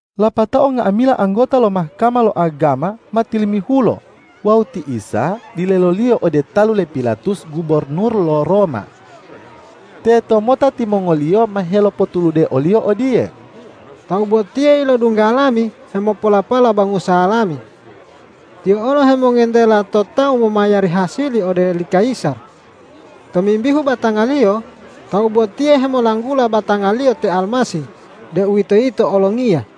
Lapatao nga'amila anggota lo Mahkama lo agama ma tilimihulo wawu ti Isa dileloliyo ode talu le Pilatus gubornur lo Roma. Tetomota timongoliyo ma helopotulude o-Liyo odiye,”Tawu botiye ilodungga lami hemopolapala bangusa lami. Tiyo olo hemongentela to tawu momayari hasili ode li kayisar. Tomimbihu batanga-Liyo, Tawu botiye hemolanggula batanga-Liyo te Almasih, deuwitoyito olongiya.”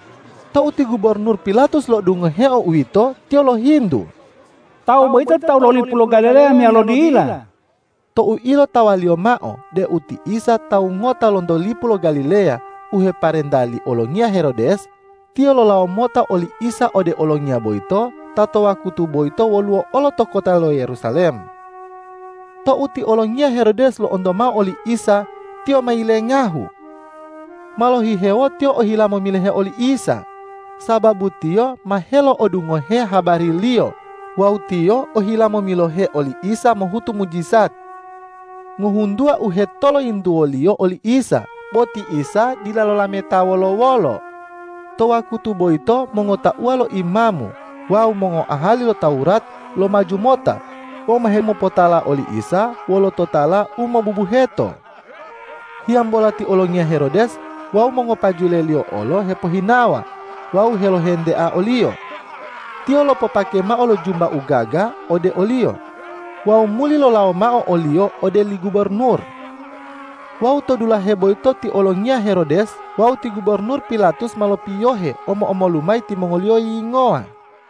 Tou ti gubornur Pilatus lo'odungoheo uwito, tiyo lohintu,”Tawu boyito tawu lo lipu lo Galileya meyalo dila?” Tou ilotawaliyo mao deu ti Isa tawu ngota lonto lipu lo Galileya u heparenta li olongiya Herodes, tiyo lolawo mota oli Isa ode olongiya boyito ta to wakutu boyito woluwo olo to kota lo Yerusalem. Tou ti olongiya Herodes lo'onto mao oli Isa, tiyo ma yilengahu. Ma lohihewo tiyo ohila momilohe oli Isa, sababu tiyo ma helo'odungohe habari-Liyo wawu tiyo ohila momilohe oli Isa mohutu mujijat. Ngohuntuwa u hetoloyintuwoliyo oli Isa, bo ti Isa dila lolameta wolo-wolo. To wakutu boyito mongotauwa lo imamu wawu mongoahali lo Tawurat lomaju mota wawu ma hemopotala oli Isa wolo totala u mobubuheto. Hiyambola ti olongiya Herodes wawu mongopajuleliyo olo hepohinawa wawu helohentea o-Liyo, tiyo lopopake mao lo jumba u gaga ode o-Liyo wawu muli lolawo mao o-Liyo ode li gubornur. Wawu to dulahe boyito ti olongiya Herodes wawu ti gubornur Pilatus ma lopiyohe, omo-omolu mayi timongoliyo yiyingowa.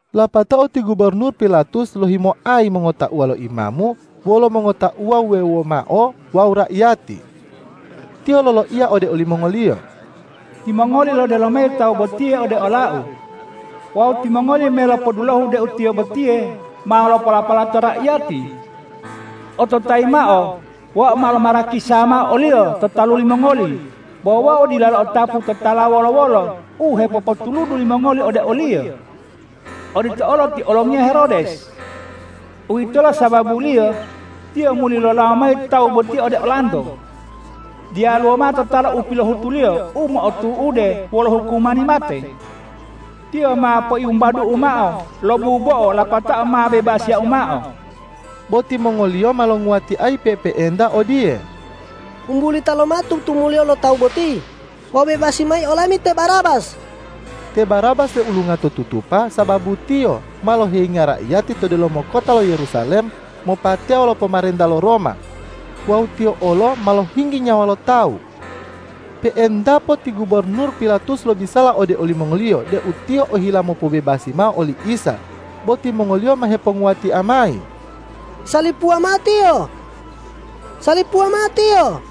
Lapatao ti gubornur Pilatus lohimoayi mongotauwa lo imamu wolo mongotauwa wuwewo mao wawu raiyati. Tiyo loloiya ode olimongoliyo,”Timongoli lodelo mayi Tawu botiye ode olau. Wawu timongoli me lopodulohu deu Tiyo botiye ma lopolapala to raiyati. Ototayi mao: Wau ma lomarakisa mao o-Liyo to talu limongoli, bo wau dila lo'otapu totala wolo-wolo u hepopotuludu limongoli ode o-Liyo. Odito olo ti olongiya Herodes. Uwitolo sababuliyo tiyo muli lolawo mayi Tawu boti ode olanto. Diyaluwo mao totala u pilohutu-Liyo u motu'ude wolo hukumani mate. Tiyo ma poiwumbadu'u mao lo bubo'o lapatao ma bebasiyau mao.” Bo timongoliyo ma longuwatiayi pe'epe'enta odiye,”Wumbulita lomao tutumuliyo lo Tawu boti! Wawu bebasi mayi olami te Barabas!” Te Barabas leulunga to tutupa, sababu tiyo ma loheyinga raiyati to delomo kota lo Yerusalem mopateya wolo pomarenta lo Roma wawu tiyo olo ma lohinggi nyawa lo tawu. Pe'entapo ti gubornur Pilatus lobisala ode olimongoliyo deu tiyo ohila mopobebasi mao oli Isa. Bo timongoliyo ma heponguwatia mayi,”Salipuwa mao Tiyo! Salipuwa mao Tiyo!”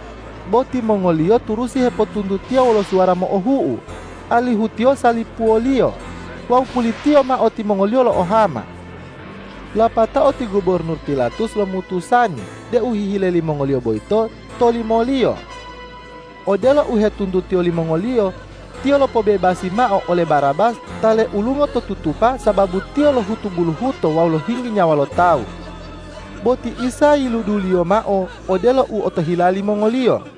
Bo timongoliyo turusi hepotuntutiya wolo suwara mo'ohu'u, alihu Tiyo salipuwoliyo, wawu pulitiyo mao timongoliyo lo'ohama. Lapatao ti gubornur Pilatus lomutusani deu hihile limongoliyo boyito tolimoliyo. Odelo u hetuntutiyo limongoliyo, tiyo lopobebasi mao ole Barabas ta leulungo to tutupa sababu tiyo lohutu buluhuto wawu lohinggi nyawa lo tawu. Bo ti Isa yiluduliyo mao odelo u otohila limongoliyo.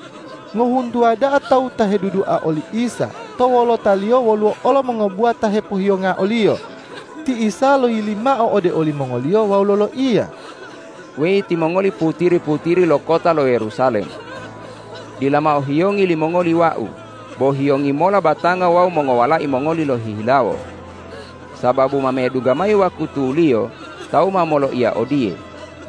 Ngohuntuwa da'a tawu ta hedudua oli Isa to wolotaliyo woluwo olo mongobuwa ta hepohiyonga o-Liyo. Ti Isa loyili mao ode olimongoliyo wawu loloiya,”Weyi timongoli putiri-putiri lo kota lo Yerusalem! Dila mao hiyongi limongoli Wau, bo hiyongi mola batanga wawu mongowalai mongoli lohihilawo! Sababu ma medungga mayi wakutuliyo tawu ma moloiya odiye,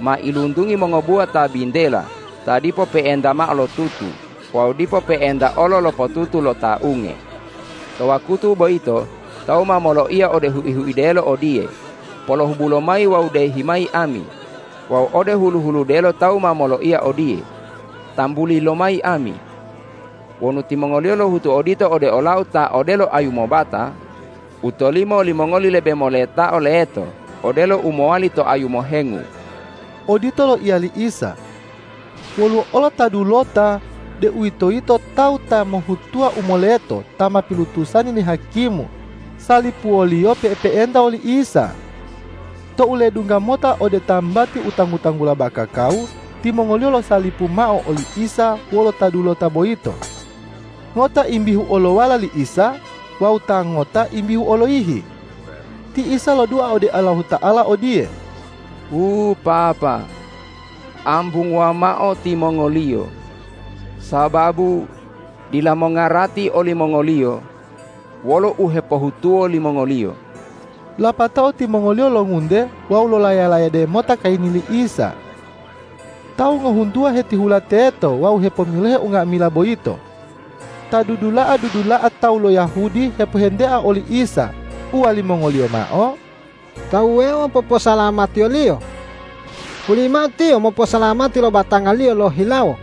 ’Mailuntungi mongobuwa ta bintela ta dipo pe'enta mao lotutu wawu dipo pe'enta olo lopotutu lo ta unge!’ To wakutu boyito tawu ma moloiya ode hui-huidelo odiye, ’Polohubu lomayi wawu dehi mayi ami!’ wawu ode hulu-huludelo tawu ma moloiya odiye, ’Tambuli lomayi ami!’ Wonu timongoliyo lohutu odito ode ola-U ta odelo ayu mobata, u tolimo limongoli lebe moletao leto odelo u mowali to ayu mohengu.” Odito loiya li Isa. Woluwo olo ta dulota, deuwitoyito tawu ta mohhutuwa u moleto ta ma pilutusani li hakimu salipuwoliyo pe'epe'enta woli Isa. Tou ledungga mota ode tambati u tanggu-tanggula Bakakawu, timongoliyo losalipu mao oli Isa wolo ta dulota boyito. Ngota imbihu olowala li Isa wawu ta ngota imbihu oloyihi. Ti Isa lodua ode Allahuta'ala odiye,”Wu Papa, ambunguwa mao timongoliyo! Sababu dila mongarati olimongoliyo wolo u hepohutuwo limongoliyo.” Lapatao timongoliyo longunte wawu lolaya-layade mota kayini li Isa. Tawu ngohuntuwa hetihula teto wawu hepomilohe unga'amila boyito. Ta dudula'a-dudula'a tawu lo Yahudi hepohentea oli Isa, uwalimongoliyo mao,”Ta wuwewo poposalamatiyo-Liyo. Hulimao Tiyo moposalamati lo batanga-Liyo lohihilawo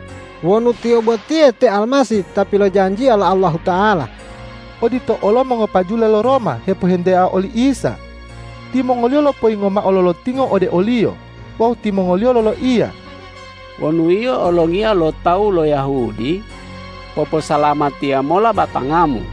wonu Tiyo botiye te Almasih ta pilojanjiya lo Allahuta'ala!” Odito olo mongopajule lo Roma hepohentea oli Isa. Timongoliyo lopoyingo mao lo lotingo ode o-Liyo. Wawu timongoliyo loloiya,”Wonu Yio olongiya lo tawu lo Yahudi, poposalamatiya mola batanga-Mu!”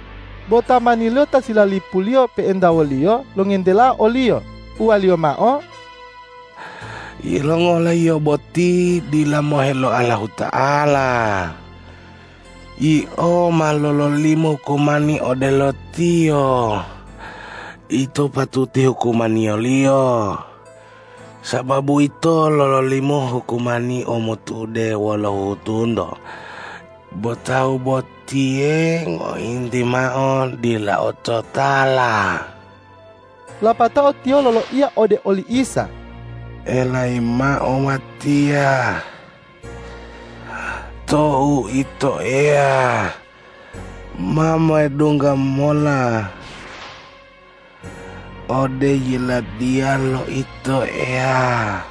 Bo tamaniliyo ta silalipuliyo pe'enta woliyo longentelao oliyo, uwaliyo mao,”Yilongola yio boti dila mohe lo Allahuta'ala? Yio ma lololimo hukumani odelo Tiyo. Ito patuti hukumaniyoliyo, sababu ito lololimo hukumani u motu'ude wolo huhutunto, bo Tawu botiye ngointi mao dila ototala.” Lapatao tiyo loloiya ode oli Isa,”Elayi mao watiya tou Ito Eya ma medungga mola ode Yiladiya lo Ito Eya.”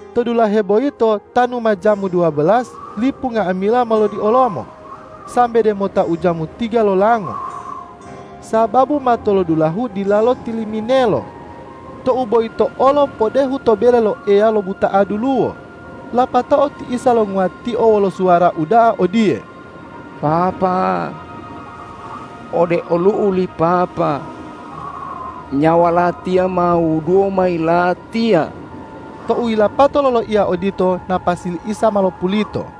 To dulahe boyito tanu ma jamu duwabelas, lipu nga'amila ma lodiolomo sambe demota ujamu tiga lolango, sababu matolodulahu dilalo tiliminelo. Tou boyito olo podehu to bele lo Eya lobuta'a duluwo. Lapatao ti Isa longuwatio wolo suwara uda'a odiye”Papa, ode olu'u li Papa nyawa Latiya ma wuduwo mayi Latiya.” Tou yilapato loloiya odito, napasi li Isa ma lopulito.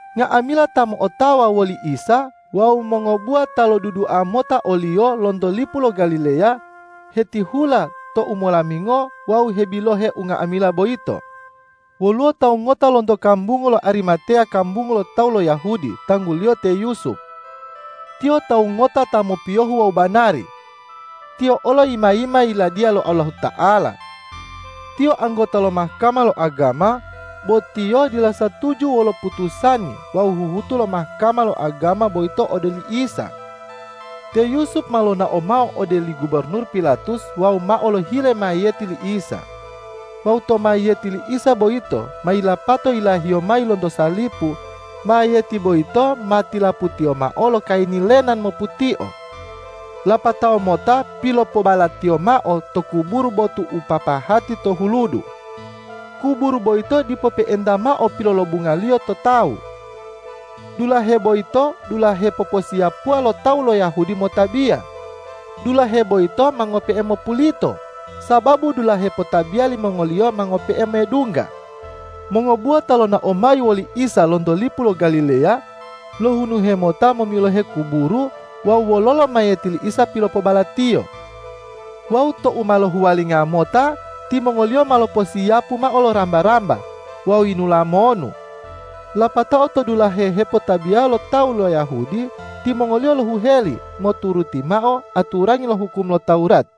Nga'amila ta mo'otawa woli Isa wawu mongobuwa ta lodudua mota o-Liyo lonto lipu lo Galileya, hetihula to umolamingo wawu hebilohe unga'amila boyito. Woluwo tawu ngota lonto kambungu lo Arimateya kambungu lo tawu lo Yahudi tangguliyo te Yusup. Tiyo tawu ngota ta mopiyohu wawu banari. Tiyo olo yima-yima Yiladiya lo Allahuta'ala. Tiyo anggota lo Mahkama lo agama, bo tiyo dila satuju wolo putusani wawu huhutu lo Mahkama lo agama boyito ode oli Isa. Te Yusup ma lonao mao ode li gubornur Pilatus wawu mao lohile mayiyeti li Isa. Wawu tou mayiyeti li Isa boyito ma yilapato yilahiyo mayi lonto salipu, mayiyeti boyito ma tilaputiyo mao lo kayini lenan moputio. Lapatao mota pilopobalatiyo mao to kuburu botu u papahati to huludu. Kuburu boyito dipo pe'enta mao pilolobungaliyo to tawu. Dulahe boyito dulahe poposiyapuwa lo tawu lo Yahudi motabiya. Dulahe boyito ma ngope'e mopulito, sababu dulahe potabiya limongoliyo ma ngope'e medungga. Mongobuwa ta lonao mayi woli Isa lonto lipu lo Galileya, lohunuhe mota momilohe kuburu wawu wololo mayiyeti li Isa pilopobalatiyo. Wawu tou ma lohuwalinga mota, timongoliyo ma loposiyapu mao lo ramba-ramba wawu yinula monu. Lapatao to dulahe hepotabiya lo tawu lo Yahudi, timongoliyo lohuheli moturuti mao aturangi lo hukum lo Tawurat.